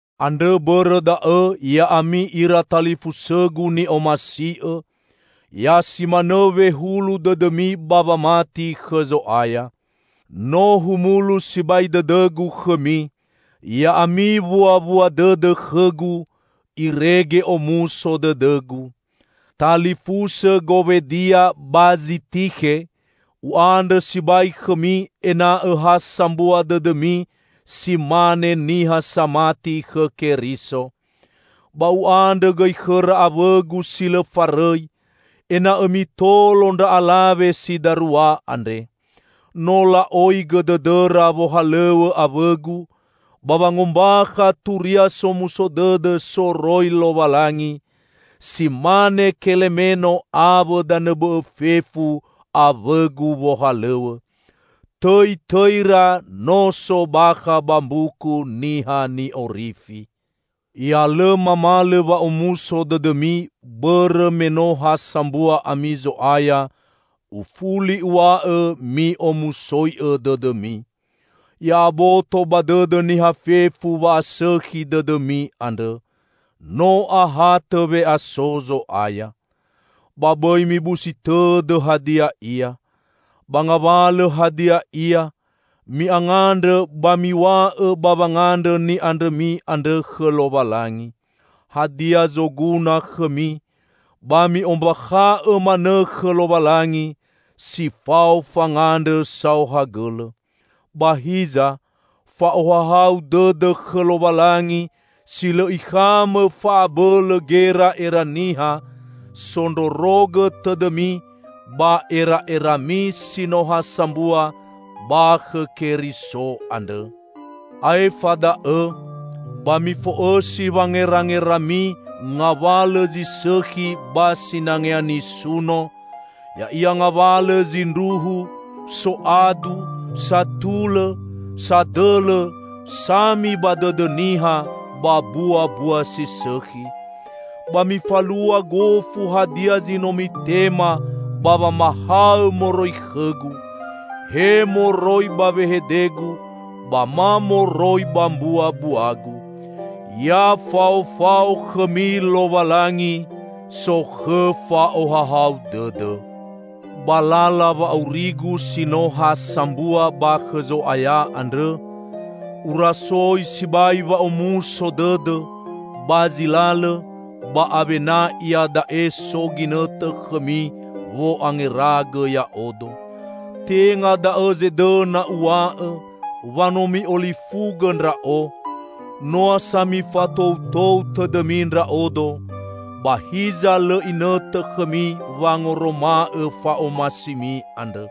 Andrõ bõrõ da'õ, ya'ami ira talifusõgu ni'omasi'õ, ya simanõ wehulu dõdõmi ba wamati khõ Zo'aya. No humulu sibai dõdõgu khõmi! Ya'ami wuawua dõdõ khõgu, irege omuso dõdõgu. Talifusõ Gowedia ba Zitikhe! U'andrõ sibai khõmi ena'õ ha sambua dõdõmi si mane niha samati khõ Keriso. Ba u'andrõ gõi khõra awõgu si lõ farõi, ena'õ mitolo ndra alawe si darua andre. No la'oigõ dõdõra wohalõw̃õ awõgu ba wangombakha Turia Somuso Dõdõ soroi Lowalangi; si mane Kelemeno awõ danõ bõ'õ fefu aw̃õgu wohalõw̃õ. Tõitõira no so bakha ba Mbuku Niha Ni'orifi. Ya lõ mamalõ wa'omuso dõdõmi bõrõ me no ha sambua ami Zo'aya, ufuli uw̃a'õ: mi'omusoi'õ dõdõmi! Ya'aboto ba dõdõ niha fefu wa'asõkhi dõdõmi andrõ. No ahatõ we'aso Zo'aya. Ba bõi mibusi tõdõ hadia ia. Ba ngawalõ hadia ia, mi'angandrõ ba miw̃a'õ ba wangandrõ ni'andrõmi andrõ khõ Lowalangi. Hadia zoguna khõmi, ba mi'ombakha'õ manõ khõ Lowalangi, si fao fangandrõ saohagõlõ. Ba hiza, fa'ohahau dõdõ khõ Lowalangi si lõ ikhamõ fa'abõlõ gera'era niha, zondrorogõ tõdõmi ba era'erami si no ha sambua ba khõ Keriso andrõ. Aefa da'õ, ba mifo'õsi wangerangerami ngawalõ zi sõkhi ba sinangea nisuno: ya'ia ngawalõ zindruhu, soadu, satulõ, sadõlõ, sami ba dõdõ niha, ba buabua si sõkhi. Ba mifalua gofu hadia zi no mitema ba wamahaõ moroi khõgu; he moroi ba wehedegu ba ma moroi ba mbuabuagu. Ya faofao khõmi Lowalangi, sokhõ fa'ohahau dõdõ. Ba lala wa'aurigu si no ha sambua ba khõ Zo'aya andrõ, urasoi sibai wa'omuso dõdõ, ba zi lalõ ba awena iada'e so ginõtõ khõmi wo'angeragõ ya'odo. Tenga da'õ zedõna uw̃a'õ wa no mi'olifugõ ndra'o; noa sa mifatoutou tõdõmi ndra'odo, ba hiza lõ inõtõ khõmi wangoroma'õ fa'omasimi andrõ.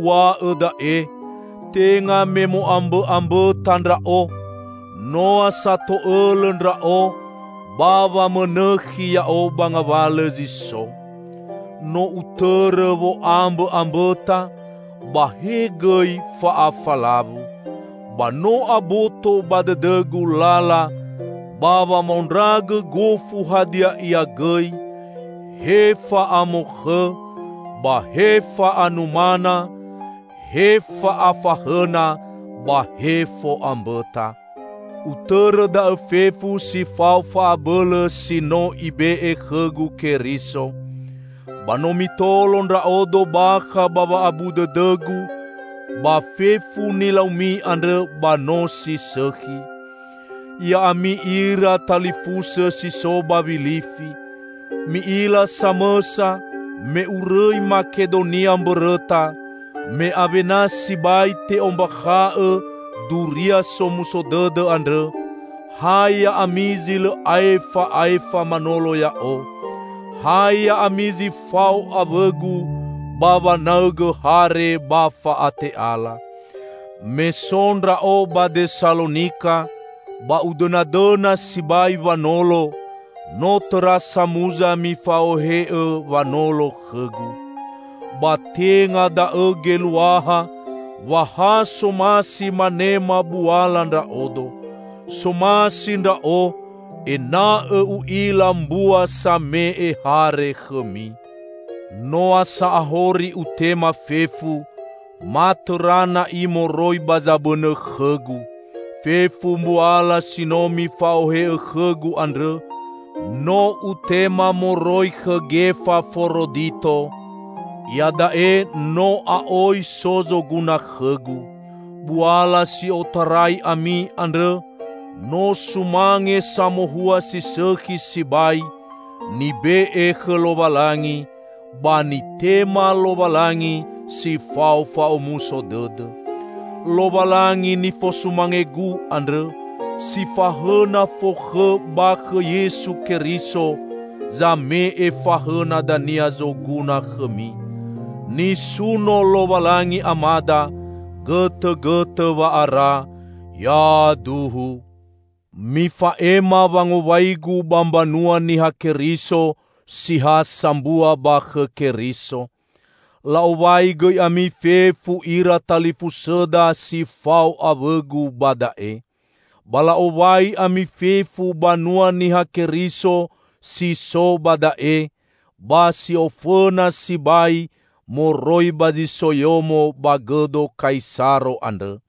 Uw̃a'õ da'e, tenga me mo'ambõ'ambõta ndra'o, noa sa to'õlõ ndra'o ba wamõnõkhi ya'o ba ngawalõ zi so. No utõrõ wo'ambõ'ambõta, ba he gõi fa'afalawu. Ba no aboto ba dõdõgu lala ba wamaondragõ gofu hadia ia gõi; he fa'amokhõ, ba he fa'anumana, he fa'afahõna ba he fo'ambõta. Utõrõ da'õ fefu, si fao fa'abõlõ si no Ibe'e khõgu Keriso. Ba no mitolo ndra'odo bakha ba wa'abu dõdõgu; ba fefu nilaumi andrõ ba no si sõkhi. Ya'ami ira talifusõ si so ba Wilifi! Mi'ila samõsa, me urõi Makedonia mbõrõta, me awena sibai te'ombakha'õ Duria Somuso Dõdõ andrõ, ha ya'ami zi lõ aefa'aefa manolo ya'o; ha ya'ami zi fao awõgu ba wanaõgõ hare ba fa'ate'ala. Me so ndra'o ba Desalonika, ba udõnadõna sibai wanolo, no tõra samuza mifa'ohe'õ wanolo khõgu. Ba tenga da'õ geluaha wa ha somasi manema buala ndra'odo. Somasi ndra'o ena'õ u'ila mbua same'e hare khõmi. Noa sa ahori utema fefu -- ma tõra na'i moroi ba zabõnõ khõgu! Fefu mbuala si no mifa'ohe'õ khõgu andrõ, no utema moroi khõ Gefaforodito. Iada'e no a'oi so zoguna khõgu. Buala si otarai ami andrõ no sumange samohua si sõkhi sibai, nibe'e khõ Lowalangi, ba nitema Lowalangi si fao fa'omuso dõdõ. Lowalangi nifosumangegu andrõ, si fahõna fokhõ ba khõ Yesu Keriso, zame'e fahõna dania zoguna khõmi. Nisuno Lowalangi Amada, gõtõgõtõ wa'ara! Yaduhu. Mifa'ema wangowaigu ba mbanua Niha Keriso si ha sambua ba khõ Keriso. La'owai gõi ami fefu ira talifusõda si fao awõgu ba da'e. Ba la'owai ami fefu banua Niha Keriso si so ba da'e, ba si ofõna sibai moroi ba zi so yomo ba gõdo Kaisaro andrõ.